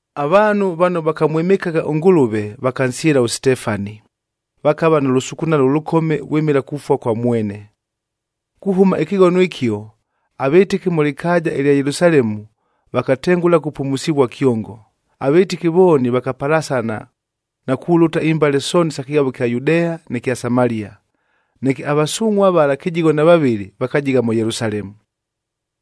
Avaanhu vano vakamwɨmɨkagha ʉNgʉlʉve, vakansyɨla ʉSitefani, vakava nʉ lʉsukunalo ʉlʉkome vwɨmɨla kufua kwa mwene. Kuhʉma ɨkɨghono ɨkio, avɨtɨki mʉ lɨkaaja ɨlya Yelusalemu vakatengʉla kupumusivua kyongo. Avɨtɨki vooni vakapalasana na kulʉta imbale sooni isa kɨghavo ɨkya Yudea, nɨ kya Samalia. Neke avasungʼhua vala kɨjigho na vavɨlɨ vakajigha mʉ Yelusalemu.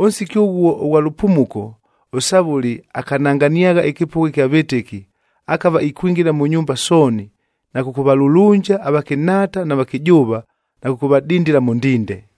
Ʉnsiki ʉghuo ʉghwa lʉpumuko, ʉSavʉli akananganiagha ɨkɨpʉgha ɨkya vɨtɨki, akava ikwingila mʉ nyumba sooni, na kʉkʉvalulunja avakɨnhaata na vakɨjʉʉva na kʉkʉvadindila mʉ ndinde.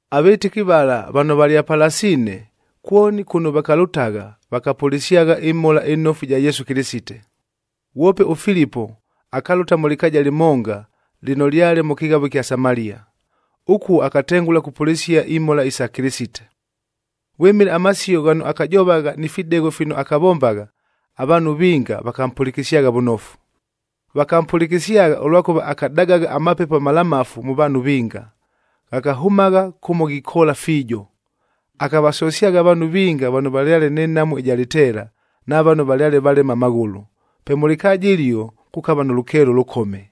Avɨtɨki vala vano valyapalasiine, kwoni kʉno vakalʉtagha vakapʉlɨsyagha ɨMhola ɨNofu ɨja Yesu Kɨlɨsite. Ghwope ʉFilipoa akalʉta mʉ lɨkaaja lɨmonga lɨno lyale mʉ kɨghavo ɨkya Samalia. Ʉkuo akatengʉla kupʉlɨsia imhola isa Kɨlɨsite. Vwɨmɨla amasio ghano akajovagha ni fidegho fino akavombagha, avaanhu vinga vakampʉlɨkɨsyagha vʉnofu. Vakampʉlɨkɨsyagha, ʉlwakʉva akadagagha amapepo amalamafu mʉ vaanhu vinga, ghakahʉmagha kʉmo ghikoola fiijo. Akavasosyagha avaanhu vinga vano valyale nɨ nhamu ɨja lɨteela, na vano valyale valema amaghʉlʉ. Pe mʉ lɨkaaja ɨlio kukava nʉ lʉkeelo ʉlʉkome.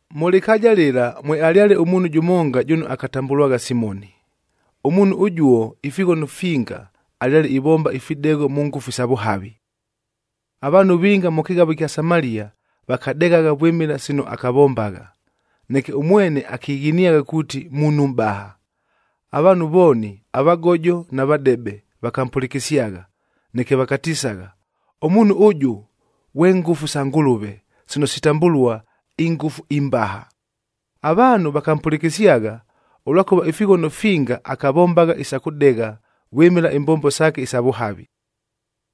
Mʉ lɨkaaja lɨla mwealyale ʉmuunhu jʉmonga jʉno akatambʉlwagha Simoni. Ʉmuunhu ʉjuo ifighono finga alyale ivomba ifidegho mʉ ngʉfu isa vʉhavi. Avaanhu vinga mʉ kɨghavo ɨkya Samalia vakadeghagha vwɨmɨla sino akavombagha. Neke ʉmwene akighiniagha kuuti muunhu mʼbaha. Avaanhu vooni, avagojo na vadebe vakampʉlɨkɨsyagha, neke vakatisagha, “Ʉmuunhu ʉjʉ, ghwe ngʉfu sa Ngʉlʉve, sino sitambʉlua, ‘INgʉfu iMbaha.’” Avaanhu vakampʉlɨkɨsyagha, ʉlwakʉva ifighono finga akavombagha isa kʉdegha vwɨmɨla imbombo saake isa vʉhavi.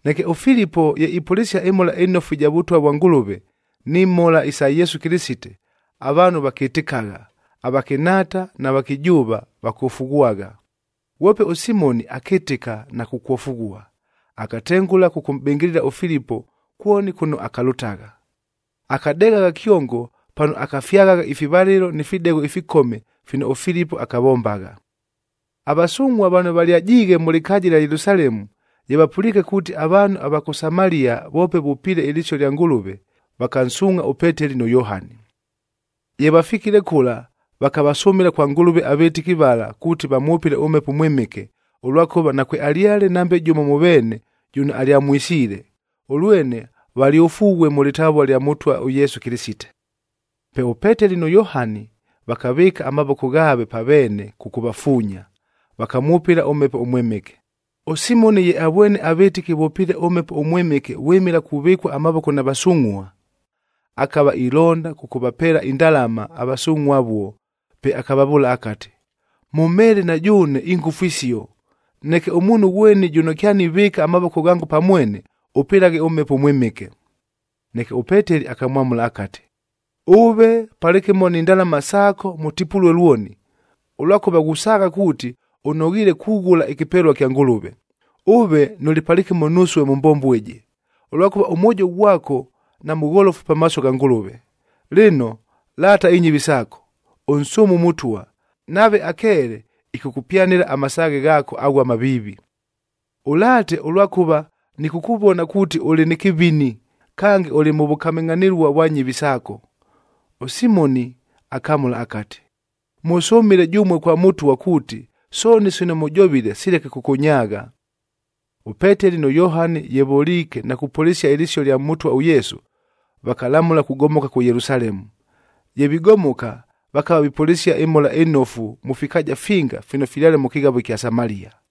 Neke ʉFilipo ye ipʉlɨsia ɨMhola ɨNofu ɨja Vʉtwa vwa Ngʉlʉve, ni mhola isa Yesu Kɨlɨsite, avaanhu vakɨtɨkagha, avakɨnhaata na vakɨjʉʉva vakofughwagha. Ghwope ʉSimoni akɨtɨka na kukwofughua, akatengʉla kʉkʉmʼbɨngɨlɨla ʉFilipo kwoni kʉno akalʉtagha. Akadeghagha kyongo pano akafyaghagha ifivalɨlo ni fidegho ifikome fino ʉFilipo akavombagha. Avasungʼhua vano valyajiighe mʉ lɨkaaja ɨlya Yelusalemu, ye vapʉliike kuuti, avaanhu ava kʉ Samalia voope vʉpiile ɨlɨsio lya Ngʉlʉve, vakansuungʼha ʉPeteli nʉ Yohani. Ye vafikile kʉla, vakavasʉmɨla kwa Ngʉlʉve avɨtɨki vala kuuti vamwʉpɨle ʉMhepo ʉMwɨmɨke, ʉlwakʉva nakwealyale nambe jʉmo mʉ veene jʉno alyamwisiile, ʉlwene valyofughue mʉ lɨtavua lya Mʉtwa ʉYesu Kɨlɨsite. Pe ʉPeteli nʉ Yohani vakavɨɨka amavoko ghaave pa veene kʉkʉvafuunya, vakamwʉpɨla ʉMhepo ʉMwɨmɨke. ɄSimoni ye avwene avɨtɨki vʉpiile ʉMhepo ʉMwɨmɨke vwɨmɨla kuvɨkua amavoko na vasungʼhua, akava ilonda kʉkʉvapeela indalama avasungʼhua avuo, pe akavavʉʉla akati, “Mʉmheele na jʉʉne ingʉfu isio, neke ʉmuunhu ghweni jʉno kyanivɨɨka amavoko ghango pa mwene, ʉpɨlaghe ʉMhepo ʉMwɨmɨke.” Neke ʉPeteli akamwamʉla akati, “Ʉve palɨkɨmo ni ndalama saako mʉtipulue lwoni, ʉlwakʉva ghusaagha kuuti ʉnoghiile kughʉla ɨkɨpelua kya Ngʉlʉve. Ʉve nʉlɨ palɨkɨmo nusue mʉ mbombo ɨjɨ, ʉlwakʉva ʉmwojo ghwako namʉgholofu pamaaso gha Ngʉlʉve. Lɨno, laata inyɨvi saako, ʉnsʉʉme ʉMʉtwa, nave akeele, ɨkʉkʉpyanɨla amasaaghe ghaako aghuo amaviivi. Ʉlaate, ʉlwakʉva nɨkʉkʉvona kuuti ʉlɨ nɨ kɨvini, kange ʉlɨ mʉ vʉkamɨngʼhanɨlua vwa nyɨvi saako.” ɄSimoni akamʉla akati, “Mʉsʉmɨle jʉmue kwa Mʉtwa kuuti, sooni sino mʉjovile sileke kʉkʉnyaagha.” ɄPeteli nʉ Yohani ye voliike na kupʉlɨsia ɨlɨsio lya Mʉtwa ʉYesu, vakalamʉla kugomoka kʉ Yelusalemu. Ye vigomoka, vakava vipʉlɨsia ɨMhola ɨNofu mʉ fikaaja finga fino fyale mʉ kɨghavo ɨkya Samalia.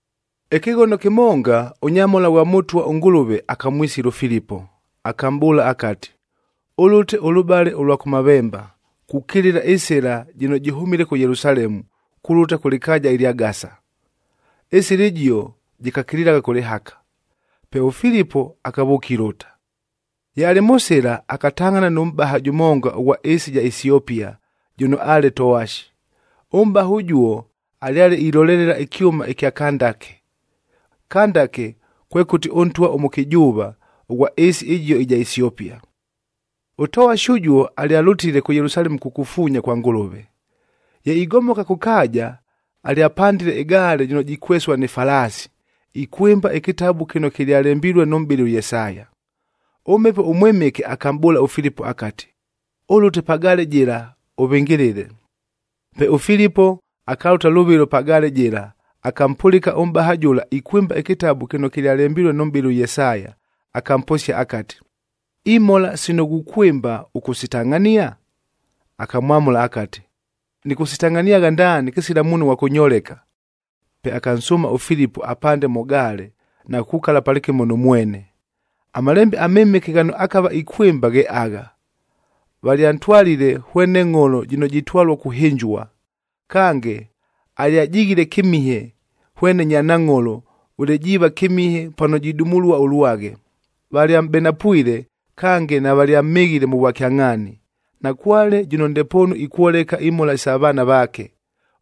Ɨkɨghono kɨmonga, ʉnyamhola ghwa Mʉtwa ʉNgʉlʉve akamwisila ʉFilipo, akamʼbʉʉla akati, “Ʉlʉte ʉlʉbale ʉlwa kʉmavemba, kukilila ɨsɨla jɨno jɨhʉmile kʉ Yelusalemu kulʉta kʉ lɨkaaja ɨlya Gasa.” Ɨsɨla ɨjio jɨkakililagha kʉ lɨhaka. Pe ʉFilipo akavʉʉka ilʉta. Ye alɨ mʉ sɨla, akatangʼhana nʉ mʼbaha jʉmonga ʉghwa ɨɨsi ɨja Esiopia jʉno aale towashi.b Ʉmʼbaha ʉjuo alyale ilolelela ɨkyʉma ɨkya Kandake. Kandake, kwekʉti ʉntwa ʉmʉkɨjʉʉva ʉghwa ɨɨsi ɨjio ɨja Esiopia. Ʉtowashi ʉjuo alyalʉtile kʉ Yelusalemu kukufuunya kwa Ngʉlʉve. Ye igomoka kʉ kaaja, alyapandile ɨgaale jɨno jikwesua ni falaasi,c ikwɨmba ɨkɨtabu kɨno kɨlyalembilue nʉ mʼbɨli ʉYesaya. ɄMhepo ʉMwɨmɨke akamʼbʉʉla ʉFilipo akati, “Ʉlʉte pa gaale jɨla, ʉvɨngɨlɨle.” Pe ʉFilipo akalʉta lʉvɨlo pa gaale jɨla, akampʉlɨka ʉmʼbaha jʉla ikwɨmba ɨkɨtabu kɨno kɨlyalembilue nʉ mʼbɨli ʉYesaya, akamposia akati, “Imhola sino ghukwɨmba ʉkʉsitangʼhania?” Akamwamʉla akati, “Nɨkʉsitangʼhaniagha ndaani kɨsila muunhu ghwa kʉnyoleka!” Pe akansʉʉma ʉFilipo apande mʉ gaale na kukukala palɨkɨmo nʉ mwene. AMalembe aMɨmɨke ghano akava ikwɨmba ghe agha, “Valyantwalile hwene ngʼholo jɨno jitwalua kuhɨnjua, kange, alyajighile kɨmihe hwene nyanangʼholo, vʉle jiiva kɨmihe pano jidumulua ʉlwaghe. Valyamʼbenapwile kange navalyamhɨghile mʉ vwakyangʼhaani. Nakwale jʉno ndepoonu ikwoleka imhola isa vaana vaake,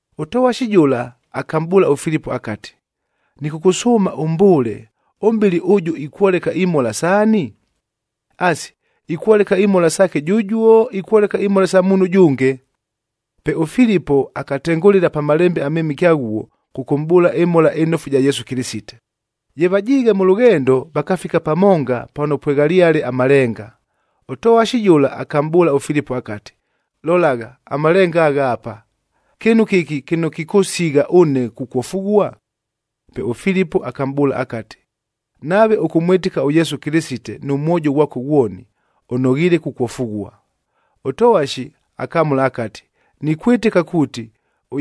Ʉtowashi jʉla akamʼbʉʉla ʉFilipo akati, “Nɨkʉkʉsʉʉma ʉmbʉʉle, ʉmʼbɨli ʉjʉ ikwoleka imhola saani? Asi, ikwoleka imhola saake jʉjuo, ikwoleka imhola isa muunhu ʉjʉnge?” Pe ʉFilipo akatengʉlɨla pa Malembe aMɨmɨke aghuo kʉkʉmʼbʉʉla ɨMhola ɨNofu ɨja Yesu Kɨlɨsite. Ye vajiighe mʉ lʉghendo, vakafika pamonga pano pweghalyale amalenga. Ʉtowashi jʉla akamʼbʉʉla ʉFilipo akati, “Lolagha, amalenga agha apa! Kɨɨnu kɨki kɨno kɨkʉsigha ʉne kukwofughua?” Pe ʉFilipo akamʼbʉʉla akati, “Nave ʉkʉmwɨtɨka ʉYesu Kɨlɨsite nʉ mwojo ghwako ghwoni, ʉnoghiile kukwofughua.” Ʉtowashi akamʉla akati, “Nikwɨtɨka kuuti,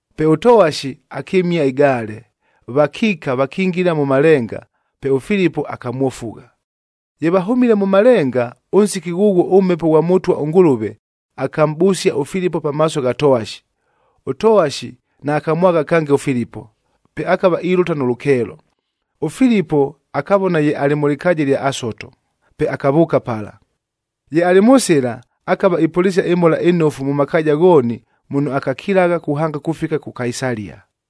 Pe ʉtowashi akɨmia ɨgaale, vakiika vakingila mʉ malenga, pe ʉFilipo akamwofugha. Ye vahʉmile mʉ malenga, ʉnsiki ghʉghuo ʉMhepo ghwa Mʉtwa ʉNgʉlʉve akamʼbʉsia ʉFilipo pamaaso gha towashi. Ʉtowashi naakamwagha kange ʉFilipo, pe akava ilʉta nʉ lʉkeelo. ɄFilipo akavona ye alɨ mʉ lɨkaaja ɨlya Asoto, pe akavʉʉka pala. Ye alɨ mʉ sɨla, akava ipʉlɨsia ɨMhola ɨNofu mʉ makaaja ghooni muno akakilagha kuhanga kufika kʉ Kaisalia.